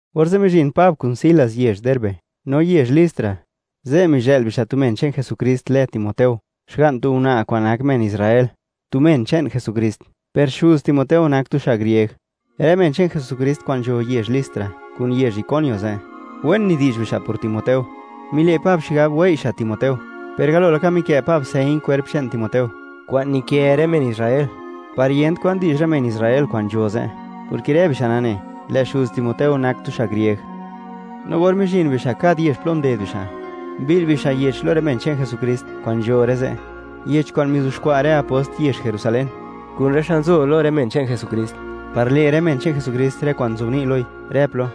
Orze' mizhin Pab kun Silas yezh Derbe, no yezh Listra. Ze' mizhë'l bixa' tu men che'n Jesukrist lë Timoteo, xga'n tu una' kwa'n nak men Israel, tu men che'n Jesukrist, per xuz Timoteo nak tu xa' grieg. Rë men che'n Jesukrist kwa'n nzho yezh Listra kun yezh Iconio ze', wen nidi'zh bixa' por Timoteo. Mile' Pab xigab wei' xa' Timoteo, per galo laka mikë' Pab señ kwerp che'n Timoteo, kwa'n nikë rë men Israel, par yent kwan di'zh rë men Israel kwa'n nzho ze', porke rë bixa' nane, lë' xuz Timoteo nak tu xa' grieg. No or mizhin bixa' kad yezh plo nded bixa', mbi'l bixa' yech lo rë men che'n Jesukrist kwa'n nzho rë ze', yech kwa'n mizuxkwa' rë apost yezh Jerusalén, kun rë xa' nzo lo rë men che'n Jesukrist, par le' rë men che'n Jesukrist rë kwa'n nzobni' loi, rë plo.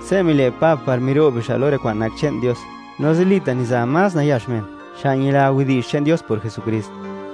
Se' mile' Pab par miro'b bixa' lo rë kwa'n nak che'n Dios, no zilita' niza más nayax men xa' ñila widi'zh che'n Dios por Jesukrist.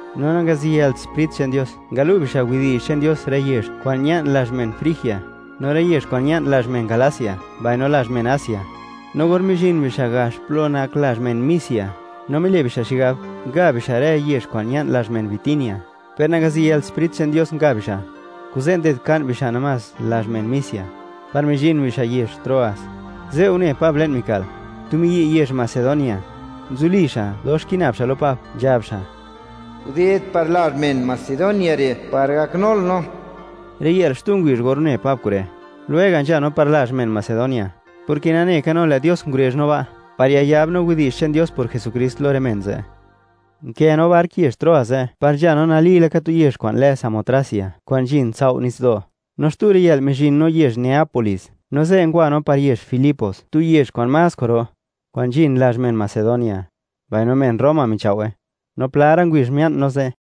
No nangaziyëlt Sprit che'n Dios ngalu' bixa' widi'zh che'n Dios rë yezh kwa'n ña'n lazh men Frigia, no rë yezh kwa'n ña'n lazh men Galacia mbaino lazh men Asia. No or mizhin bixa' gax plo nak lazh men Misia, no mile' bixa' xigab, nga bixa' rë yezh kwa'n ña'n lazh men Bitinia, per nangaziyëlt Sprit che'n Dios nga bixa'. Kuze' ndedka'n bixa' namás lazh men Misia, par mizhin bixa' yezh Troas. Ze' une Pab le'n mika'l, tu miyi' yezh Macedonia, nzuli xa', dox kina'b xa' lo Pab, nzhab xa': “Guded par lazh men Macedonia re' par gaknul no.” Riyë'l xtu ngubizh or une Pab kure', lwega' nzha no par lazh men Macedonia, porke nane ka no, lë' Dios ngurezh no ba', par yayab no widi'zh che'n Dios por Jesukrist lo rë men ze'. Nkë no bark yezh Troas ze', par nzha no nali laka tu yezh kwa'n lë Samotracia, kwa'n nzhin tsao' nitsdo', no xtu riyë'l, mizhin no yezh Neápolis. No ze' ngwa no par yezh Filipos, tu yezh kwa'n más kwa'ro, kwa'n nzhin lazh men Macedonia, mbaino men Roma michao'we. No pla ra' ngubizh mia'n no ze'.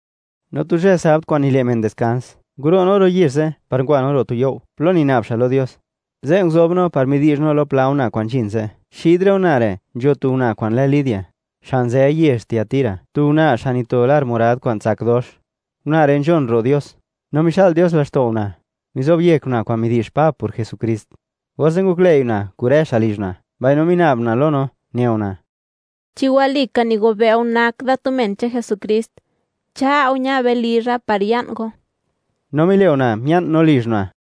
No tu zhë Sabd kwa'n nile' men diskans, nguro' no ro' yezh ze' par ngwa no ro' tu you' plo nina'b xa' lo Dios. Ze' nguzob no par midi'zh no lo pla una' kwa'n nzhin ze'. Xid rë una' re' nzho tu una' kwa'n lë Lidia, xa' nzë yezh Tiatira, tu una' xa' nito lar morad kwa'n tsak dox. Una' re' nzhon ro' Dios. No mixa'l Dios laxto' una', mizob yek una' kwa'n midi'zh Pab por Jesukrist. Orze' ngoklëi' una' kun rë xa' lizh una', mbaino mina'b una' lo no, ne una': ―Chi walika nigobe' go nak da tu men che'n Jesukrist, cha' go ña be lizha par ya'n go. No mile' una' mia'n no lizh una'.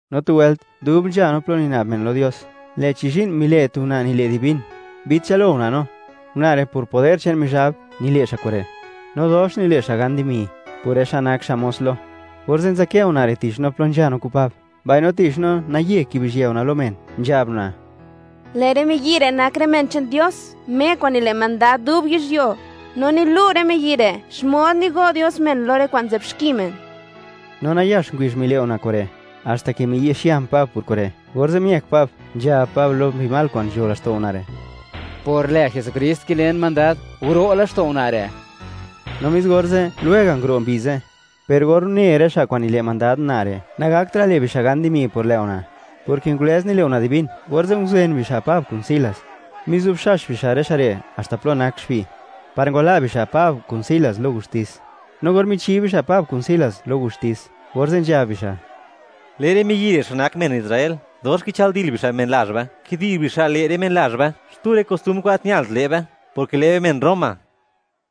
No tu wëlt, dub nzha no plo nina'b men lo Dios, lë'chi zhi'n mile' tu una' nile' divín, mbi'dchël-lo una' no. Una' re' por poder che'n Mizhab, nile' xa' kure', no dox nile' xa' gan dimi, por rë xa' nak xa' mos lo. Orze' nzadkë una' re' tich no plo nzha no kun Pab, mbaino tich no, naye kibizhië una' lo men, nzhab una': ―¡Lë' rë miyi' re' nak rë men che'n Dios, Me kwa'n nile' mandad dub yizhyuo, no nilu' rë miyi' re' xmod nigo' Dios men lo rë kwa'n nzë'b xki men! No nayax ngubizh mile' una' kure', haxta ke miyi'xian Pab por kure', orze' miëk Pab nzhab Pab lo mbi mal kwa'n nzho laxto' una' re': ―¡Por lë Jesukrist kilen mandad, guro' laxto' una' re'! No mis orze', lwega' nguro' mbi ze'. Per or une rë xa' kwa'n nile' mandad una' re', nagaktra' le' bixa' gan dimi por lë' una', porke ngulëz nile' una' divín, orze' nguzen bixa' Pab kun Silas, mizubxax bixa' rë xa' re' haxta plo nak xbi', par ngwala' bixa' Pab kun Silas lo gustis. No or michi bixa' Pab kun Silas lo gustis, orze' nzhab bixa': ―Lë' rë miyi' re', xa' nak men Israel, dox kichëldil bixa' men lazh be, kidi'zh bixa' le' rë men lazh be xtu rë kostumbr kwa'n gat ñalt le' be, porke lë' be men Roma.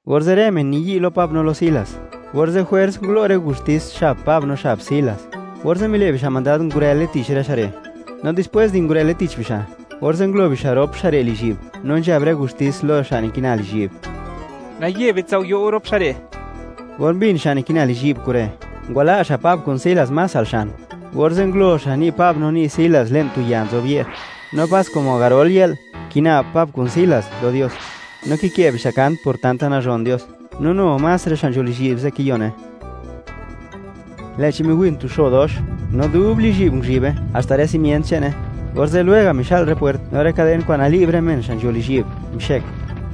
Orze' rë men niyi' lo Pab no lo Silas. Orze' jwers ngulo' rë gustis xab Pab no xab Silas, orze' mile' bixa' mandad ngurële tich rë xa' re'. No dispwés di ngurële tich bixa', orze' ngulo bixa' rop xa' re' lizhyi'b, no nzhab rë gustis lo xa' nikina lizhyi'b: “¡Naye bitsao'yo' go rop xa' re'!” Or mbin xa' nikina lizhyi'b kure'; ngwala' xa' Pab kun Silas más al xan, orze' ngulo xa' ni' Pab no ni' Silas le'n tu ya nzob ye'r. No pas como garol yë'l, kina'b Pab kun Silas lo Dios, no kikë' bixa' kant por tanta nazhon Dios, no nu más rë xa' nzho lizhyi'b ze' kiyone. Lë'chi dox tu xo ro miwin, no dub lizhyi'b nguzhibe, haxta rë simient che'ne. Orze' lwega' mixa'l rë pwert, no rë kaden kwa'n nali'b rë men xa' nzho lizhyi'b, mixëk.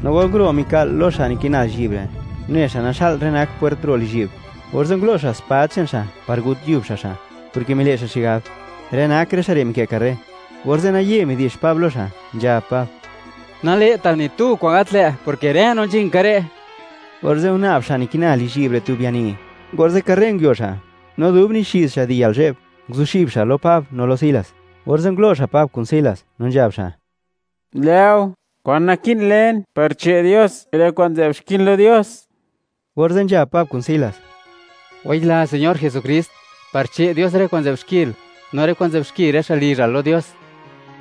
No or nguro' mika'l lo xa' nikina lizhyi'b re', une xa' naxa'l rë nak pwert ro' lizhyi'b, orze' ngulo' xa' spad che'n xa' par gut yub xa' xa', porke mile' xa' xigab: “Rë nak rë xa' re', mikë' karre.” Orze' naye midi'zh Pab lo xa', nzhab Pab: ―¡Nale'tal ni tu kwa'n gat lë', porke rë no nzhin ka re'! Orze' guna'b xa' nikina lizhyi'b re' tu biani, orze' karre nguio xa', no dub nixiz xa' di yalzhe'b, nguzuxib xa' lo Pab no lo Silas, orze' ngulo' xa' Pab kun Silas, no nzhab xa': ―Lë'o, ¿kwan naki'n len par che' Dios rë kwa'n nzë'bxkin lo Dios? Orze' nzhab Pab kun Silas: ―Wayila Señor Jesukrist, par che' Dios rë kwa'n nzë'b xkil, no rë kwa'n nzë'b xki rë xa' lizhal lo Dios.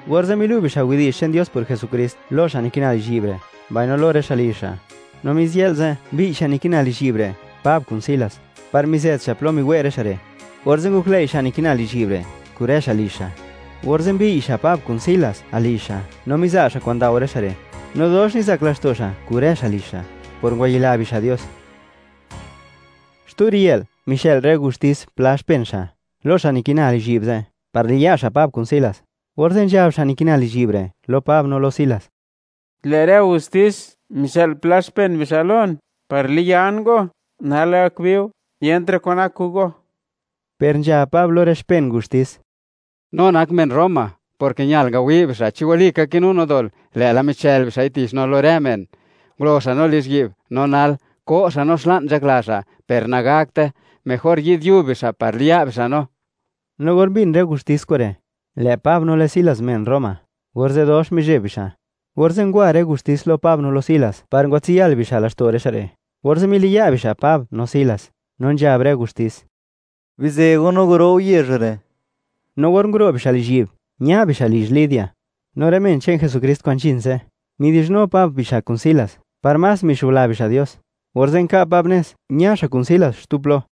Orze' milu' bixa' widi'zh che'n Dios por Jesukrist lo xa' nikina lizhyi'b re', mbaino lo rë xa' lizh xa'. No mis yë'l ze', mbiy' xa' nikina lizhyi'b re', Pab kun Silas, par mizët xa' plo miwe' rë xa' re', orze' ngoklëi' xa' nikina lizhyi'b re', kun rë xa' lizh xa'. Orze' mbiy' xa' Pab kun Silas al lizh xa', no miza' xa' kwa'n ndao rë xa' re'. No dox nizak laxto' xa' kun rë xa' lizh xa', por ngwayila bixa' Dios. Xtu riyë'l, mixë'l rë gustis pla xpen xa', lo xa' nikina lizhyi'b ze', par liya' xa' Pab kun Silas, orze' nzhab xa' nikina lizhyi'b re' lo Pab no lo Silas: ―Lë' rë gustis, mixë'l pla xpen bixa' lon, par liyan go, nal gak bi go, yentra' kwan nak kun go. Per nzhab Pab lo rë xpen gustis: ―No nak men Roma, porke ñal ngawi' bixa' chi walika kinu no dol, lë'la michël bixa'i tich no lo rë men, ngulo xa' no lizhyi'b. No nal, ¿ko' xa' no xla'n nzhakla xa'? Per nagakte. Mejor yi'd yub bixa', par liya' bixa' no. No or mbin rë gustis kure', lë' Pab no lë' Silas men Roma, orze' dox mizheb bixa'. Orze' ngwa rë gustis lo Pab no lo Silas, par ngwatsiyal bixa' laxto' rë xa' re', orze' miliya' bixa' Pab no Silas, no nzhab rë gustis: “Bizë go, no guro' go yezh re'.” No or nguro' bixa' lizhyi'b, ña bixa' lizh Lidia. No rë men che'n Jesukrist kwa'n nzhin ze', midi'zhnu Pab bixa' kun Silas, par más mixubla bixa' Dios. Orze' nka' Pab nez, ña xa' kun Silas xtu plo.